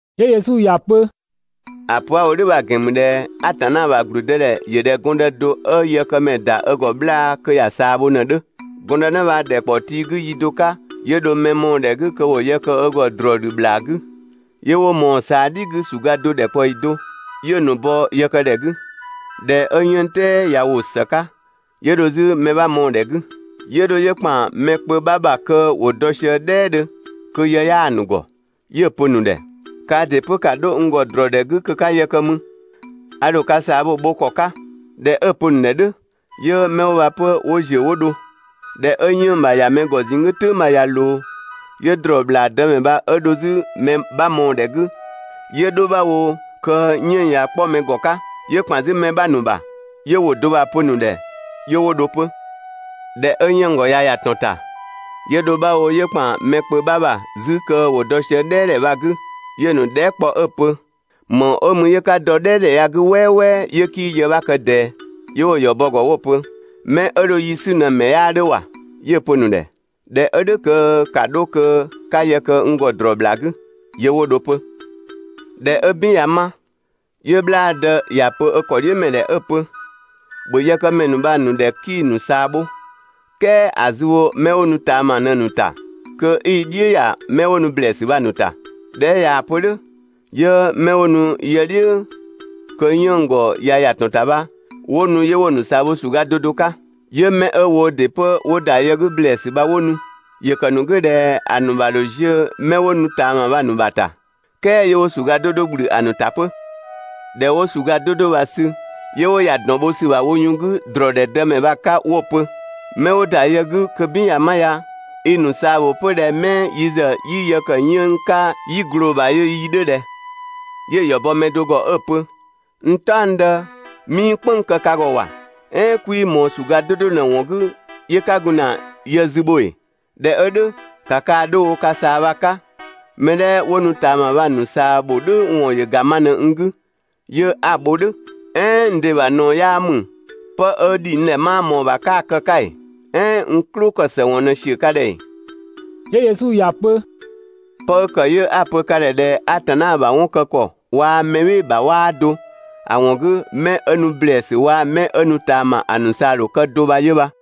'Yö Yesu ‑ya pö: «‑A pö 'a‑ wo "dhʋ̈ bha‑ ‑gɛn ‑mü ꞊dhɛ Atanna ‑bha ‑gblüdëdhɛ ‑yö ꞊dhɛ gɔndë do 'ö yëkëmɛ ‑da ö ‑gɔ 'bhlaa‑ kö ‑ya ꞊saa bho ꞊në‑ 'dhö. Gɔndënë bha ‑dhɛkpaɔ tii 'gü yi do 'ka 'yö dho mɛ mɔɔ‑ ‑dhɛ 'gü kö ‑wo yë kë ö ‑gɔ ‑drɔɔ ‑dhü ‑bhlaa 'gü. 'Yö 'wo ꞊mɔɔ‑ ꞊saa "dhi 'gü ‑suga do ‑dhɛkpaɔyi do, 'yö‑ ‑nu bɔ yë kë ‑dhɛ 'gü. ꞊Dhɛ 'ö 'yënng‑ "tɛɛ ꞊ya ‑wo ‑së 'ka, 'yö dho 'zü mɛ 'bha mɔɔ‑ ‑dhɛ 'gü. 'Yö dho 'yö ‑kpan mɛ kpö 'bha ‑bha kö ‑wo dɔ sië "dhɛɛdhö kö yë 'yaa‑ ‑nu ‑gɔ 'yö‑ pö‑ ‑nu ‑dhɛ: Kaa ‑dɩ 'pö ‑ka 'dho n ‑gɔ ‑drɔɔdhɛ 'gü kö 'ka yë kë 'mü, a ‑dho ka ꞊saa bho‑ bho ‑kɔ 'ka.» ꞊Dhɛ 'ö‑ pö‑ ‑nu ‑dhɛ "dhʋ̈, 'yö 'mɛ 'wo bha 'pö 'wo ‑ziö 'wo dho. ꞊Dhɛ 'ö 'yënng‑ ‑ya ‑mɛ ‑gɔ ꞊zinng 'gü "tʋ̈ng bha ꞊ya ꞊loo, 'yö ‑drɔɔ ‑bhlaa dëmɛ bha 'ö dho 'zü mɛ 'bha mɔɔ‑ ‑dhɛ 'gü, 'yö 'dho 'bha wo kö 'yënng‑ ꞊ya 'kpɔ mɛ ‑gɔ 'ka, 'yö ‑kpan 'zü mɛ 'bha ‑nu ‑bha, 'yö ‑wʋ do bha‑ pö‑ ‑nu ‑dhɛ 'yö 'wo dho 'pö. ꞊Dhɛ 'ö 'yënng‑ ‑gɔ ꞊ya ‑ya ‑tɔn ‑ta, 'yö dho 'bha wo 'yö ‑kpan mɛ kpö 'bha ‑bha 'zü kö ‑wo dɔ sië "dhɛɛdhɛ bha‑ 'gü, 'yö‑ ‑nu dhɛɛ" kpɔ 'ö‑ pö: «‑Më ‑wɔn 'ö mü 'yö 'ka dɔ ‑dhɛ ya‑ 'gü "wɛɛwɛɛ 'yö 'kii yë 'bha kë ꞊dɛɛ?» 'Yö 'wo‑ ‑yɔ bɔ‑ ‑gɔ 'wo‑ pö: «'Mɛ 'ö dho yi 'sü ꞊në‑ ‑mɛ 'yaa 'dhö ‑wa!» 'Yö‑ pö‑ ‑nu ‑dhɛ: «꞊Dhɛ 'ö "dhʋ̈ kö ‑ka 'dho kö 'ka yë kë n ‑gɔ ‑drɔɔ ‑bhlaa 'gü!» 'Yö 'wo dho 'pö. ꞊Dhɛ 'ö "bin ꞊ya 'ma, 'yö 'bhlaadë ‑ya pö ö ‑kɔdhiʋ̈mɛ ‑dhɛ 'ö‑ pö: «‑Bhö yëkëmɛ ‑nu bha‑ ‑nu ‑dhɛ 'kii‑ ‑nu ꞊saa bho, "kɛɛ ‑a zü bho 'mɛ 'wo nu ꞊taama bha ꞊në‑ ‑nu ‑ta kö 'i‑ "dhiʋ̈ ta 'mɛ 'wo nu ‑blɛɛsü bha‑ ‑nu ‑ta!» ꞊Dhɛ 'ö ꞊yaa‑ pö "dhʋ̈, 'yö 'mɛ 'wo nu yë "dhiʋ̈ kö 'yënng‑ ‑gɔ ꞊ya ‑ya ‑tɔn ‑ta bha 'wo nu 'yö 'wo‑ ‑nu ꞊saa bho ‑suga 'do 'do 'ka. 'Yö 'mɛ 'ö woo ‑dɩ 'pö, 'wo ‑da yë 'gü ‑blɛɛsü bha 'wo nu. ‑Yö ‑kë ‑nu 'gü ꞊dhɛ ‑a ‑nu ‑bha ‑dho ziö 'mɛ 'wo nu ꞊taama bha‑ ‑nu ‑bha ‑ta, "kɛɛ 'yö 'wo ‑suga 'do 'do ‑gblü ‑a ‑nu ‑ta 'pö. ꞊Dhɛ 'wo ‑suga 'do 'do bha‑ sü 'yö 'wo ‑ya ‑dɔn bho ‑sü ‑bha wo yun 'gü ‑drɔɔdhɛ dëmɛ bha‑ 'ka 'wo‑ pö: «'Mɛ 'wo ‑da yë 'gü kö "bin ꞊ya ma ya, i‑ ‑nu ꞊saa ‑bho 'pö ꞊dhɛ 'mɛ yi ‑zë 'yi yë ‑kë 'yënng‑ 'ka 'yi ꞊gloo ‑bha yö yi 'dhö ꞊dhɛ?» 'Yö‑ ‑yɔ bɔ mɛ do ‑gɔ 'ö‑ pö: «N "taɔngdë, 'mii "kpënng‑ kë ka ‑gɔ ‑wa, "ɛɛn 'kwii ꞊mɔɔ ‑suga do ꞊në ‑wɔn 'gü, 'yö 'ka gun ‑na yë zü bho ‑ee?» ꞊Dhɛ 'ö "dhʋ̈, ‑ka kaa‑ 'dho wo ka ꞊saa bha‑ 'ka, mɛ 'dhɛ 'wo nu ꞊taama bha‑ ‑nu ꞊saa ‑bho "dhʋ̈ ‑wɔn ‑yö ‑ga ma ꞊në n 'gü 'yö 'a‑ bho "dhʋ̈. "Ɛɛn n ‑dɩ ‑bha ꞊naɔ 'yaa ‑mü, pë 'ö ‑dhi n ‑dhɛ 'maa ꞊mɔɔ‑ ‑bha 'kaa‑ ‑kë 'ka ‑ee? "Ɛɛn n "klʋ ‑kë ‑së ‑wɔn ꞊në ‑siö ka ‑dhɛ ‑ee?» 'Yö Yesu ‑ya pö: «'Pë 'ö ‑kë 'yö 'a‑ pö ka ‑dhɛ ꞊dhɛ (Atanna ‑bha 'wɔn kë ‑kɔ waa‑ mɛ "bhɩɩ‑ ‑bha 'waa do, ‑a ‑wɔn 'gü) 'mɛ 'ö nu ‑blɛɛsü waa‑ 'mɛ 'ö nu ꞊taama ‑a ‑nu ꞊saa‑ ‑dho kë do bha 'yö bha.»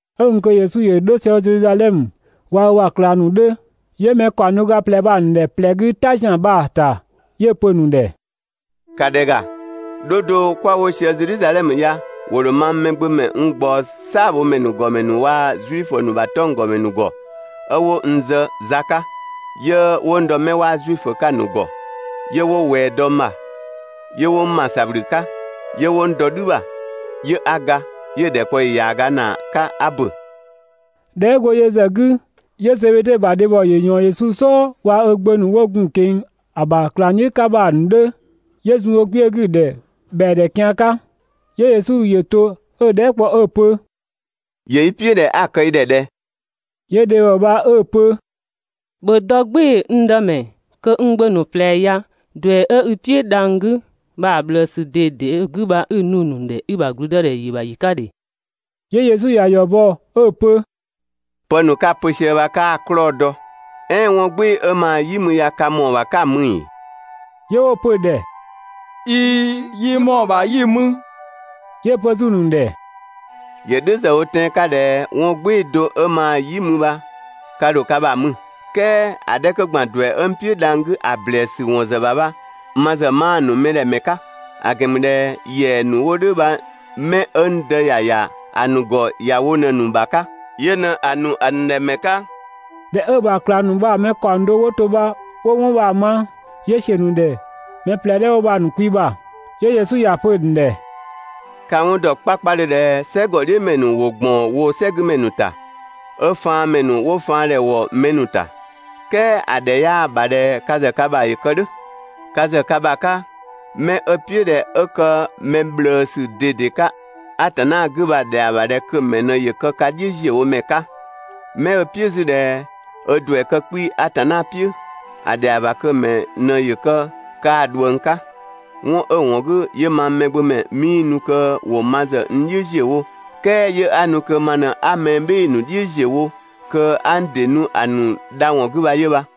'Ö gun kö Yesu ‑yö 'dho sië Zedhizadhɛmö, waa‑ ö ‑bha ꞊klang ‑nu 'yö mɛ ‑kaɔng do ga ꞊plɛ bha‑ ‑nu ‑dhɛ ꞊plɛ 'gü "ta ‑zian bha‑ ‑ta 'yö‑ pö‑ ‑nu ‑dhɛ: «‑Ka ‑dhɛ ‑ga, 'dho do 'kwa‑ wo sië Zedhizadhɛmö ya, ‑wo ‑dho mang Mɛgbömɛ n ꞊gbaɔ "saabhomɛ ‑nu ‑gɔmɛ ‑nu waa‑ Zuifö ‑nu ‑bha 'tɔnggɔmɛ ‑nu ‑gɔ 'ö 'wo n zë za 'ka, 'yö 'wo n ‑dɔ 'mɛ 'waa Zuifö 'ka‑ ‑nu ‑gɔ, 'yö 'wo ꞊wɛɛ dɔ n ‑bha, 'yö 'wo n ‑ma ‑sabhlü 'ka, 'yö 'wo n dɔ "dhü ‑bha 'yö 'a ga 'yö‑ ‑dhɛkpaɔyi ‑yaaga ‑naa 'ka 'a ‑bö. ꞊Dhɛ 'ö go yö ‑zë 'gü, 'yö Zebede ‑bha dhebhɔ ‑yö ꞊yɔɔn Yesu "sɔɔ 'waa‑ ö gbö ‑nu 'wo gun‑ ꞊keng‑ ‑a ‑bha ꞊klangdhiʋ̈ 'ka bha‑ ‑nu 'dhö 'yö zun ö kpiö 'gü‑ ‑dhɛ ‑bhɛa ‑dhɛ kian 'ka. 'Yö Yesu ‑yö to 'ö‑ dhɛɛ" kpɔ 'ö‑ pö: «‑Yö i "piʋ̈ ꞊dhɛ 'a kë i ‑dhɛ ꞊dhɛ? 'Yö dhebhɔ bha 'ö‑ pö: «‑Bhö dɔ "gbɩɩ‑, n dëmɛ, kö n gbö ‑nu ꞊plɛ ya, ‑duɛ 'ö i "piʋ̈ dhang‑ 'gü bha‑ ꞊bhlëësü ꞊dede 'ö‑ 'gü bha 'i‑ nu‑ ‑nu ‑dhɛ i ‑bha ‑gblüdëdhɛ ‑yö ‑bha ‑yi 'ka ‑dhe!» 'Yö Yesu ‑ya ‑yɔ bɔ 'ö‑ pö: «Pë ‑nu 'ka‑ pö sië bha 'kaa‑ 'klɔɔ‑ dɔ. "Ɛɛn 'wɔn "gbɩɩ‑ 'ö maa‑ "yi mü ya ka ‑mɔɔ ‑bha 'ka‑ mü ‑ee?» 'Yö 'wo‑ pö‑ ‑dhɛ: «꞊Iin, yi ‑mɔɔ ‑bha 'yi‑ mü.» 'Yö‑ pö 'zü‑ ‑nu ‑dhɛ: «‑Yö "dhʋ̈ ‑zë wo tɛan‑ 'ka ꞊dhɛ 'wɔn "gbɩɩ‑ do 'ö maa‑ "yi mü bha ka ‑dho ka ‑bha mü, "kɛɛ ‑a 'dhɛ 'kö ‑gban ‑duɛ 'ö n "piʋ̈ dhang‑ 'gü ‑a ‑blɛɛsü ‑sü ‑wɔn ‑zë ‑bha bha, ma ‑zë 'maa‑ ‑nu mɛ ‑dhɛ ‑mɛ 'ka, ‑a ‑gɛn ‑mü ꞊dhɛ ‑yɛa ‑nu 'wo "dhʋ̈ bha 'mɛ 'ö n Dë ‑ya ‑ya ‑a ‑nu ‑gɔ ‑ya wo ꞊në‑ ‑nu ‑bha 'ka.» (Yö ꞊në‑ ‑nu ‑a ‑nu ‑dhɛ ‑mɛ 'ka). ꞊Dhɛ 'ö‑ ‑bha ꞊klang ‑nu bha‑ mɛ ‑kaɔng do 'wo to 'wo 'wɔn bha‑ ma, 'yö ‑siö ‑nu ‑dhɛ mɛ ꞊plɛ 'dhɛ 'wo bha‑ ‑nu kwi ‑bha. 'Yö Yesu ‑ya pö‑ ‑nu ‑dhɛ: «Ka‑ 'wɔn ‑dɔ 'kpakpadhö ꞊dhɛ "sɛgɔdhiʋ̈mɛ ‑nu ‑wo ‑gbaɔn woo‑ "sɛgümɛ ‑nu ‑ta, 'ö faanmɛ ‑nu 'wo faan ‑dhɛ ‑wo mɛ ‑nu ‑ta. "Kɛɛ ‑a ‑dhɛ 'yaa‑ ‑bha kö ka ‑zë ka ‑bha ‑yö kë "dhʋ̈. Ka ‑zë ka ‑bha 'ka 'mɛ 'ö‑ "piʋ̈ ꞊dhɛ 'ö kë mɛ ꞊bhlëësü ꞊dede 'ka Atanna 'gü bha‑ ‑dhɛa ‑bha kö‑ ‑mɛ ꞊në ‑yö kë ka "dhiʋ̈ ‑ziö wo ‑mɛ 'ka. 'Mɛ 'ö‑ "piʋ̈ 'zü ꞊dhɛ ö ‑duɛ kë 'kpii‑ (Atanna "piʋ̈), ‑a ‑dhɛa ‑bha kö‑ ‑mɛ ꞊në ‑yö kë kaa‑ ꞊dhuëng 'ka. 'Wɔn 'ö‑ ‑wɔn 'gü 'yö mang Mɛgbömɛ 'mii nu kö ‑wo ma ‑zë n "dhiʋ̈ ‑ziö wo, "kɛɛ 'yö 'a ‑nu kö ma ꞊në 'a mɛ "bhɩɩ‑ ‑nu "dhiʋ̈ ‑ziö wo kö 'a n ‑dɩ nu ‑a ‑nu dha ‑wɔn 'gü bha 'yö bha.»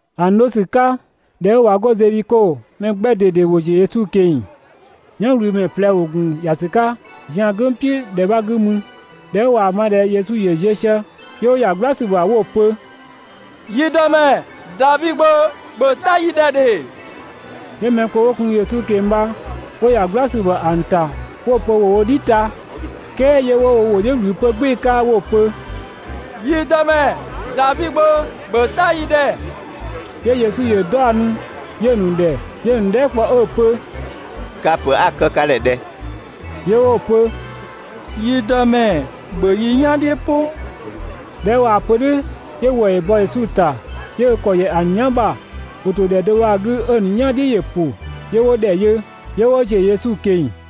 ‑A ‑nu 'dho ‑sü 'ka, ꞊dhɛ 'ö ꞊wa 'go Zedhiko, mɛ 'gbɛ ꞊dede ‑wo ‑ziö 'zü Yesu ꞊keng‑. "Yanwlümɛ ꞊plɛ ‑wo ‑gun ‑ya ‑sü 'ka zian "gʋ̈ng "piʋ̈ ‑dhɛ 'bha 'gü mü. ꞊Dhɛ 'ö ꞊waa‑ ma ꞊dhɛ Yesu ‑yö ziö sië, 'yö 'wo ‑ya "gbla ‑sü ‑bha 'wo‑ pö: «Yi Dëmɛ, Davi Gbö, ‑bhö "ta yi ‑dhɛ ‑dhe!» 'Yö mɛ kpö 'wo gun Yesu ꞊keng‑ bha 'wo ‑ya "gbla ‑sü ‑bha ‑a ‑nu ‑ta 'wo‑ pö ‑wo wo "dhi ta. "Kɛɛ 'yö 'wo wo ‑wʋ "dhiʋ̈ ꞊wlü 'pö "gbɩɩ‑ 'ka 'wo‑ pö: «Yi Dëmɛ, Davi Gbö, ‑bhö "ta yi ‑dhɛ!» 'Yö Yesu ‑yö 'daɔnnu, 'yö‑ ‑nu ‑dhɛ, 'yö‑ ‑nu dhɛɛ" kpɔ 'ö‑ pö: «Ka‑ ‑pö 'a‑ kë ka ‑dhɛ ꞊dhɛ?» 'Yö 'wo‑ pö: «Yi Dëmɛ, ‑bhö yi "yan "dhiʋ̈ "pʋ!» ꞊Dhɛ 'ö ꞊waa‑ pö "dhʋ̈ 'yö ‑wëë ‑yö bɔ Yesu ‑ta, 'yö ö ‑kɔ ‑yɛ ‑a ‑nu "yan ‑bha, ‑wo ‑to ‑dhɛ do bha‑ 'gü 'ö‑ ‑nu "yan "dhiʋ̈ ‑yö ‑pʋ 'yö 'wo ‑dhɛ yö, 'yö 'wo ‑ziö Yesu ꞊keng‑.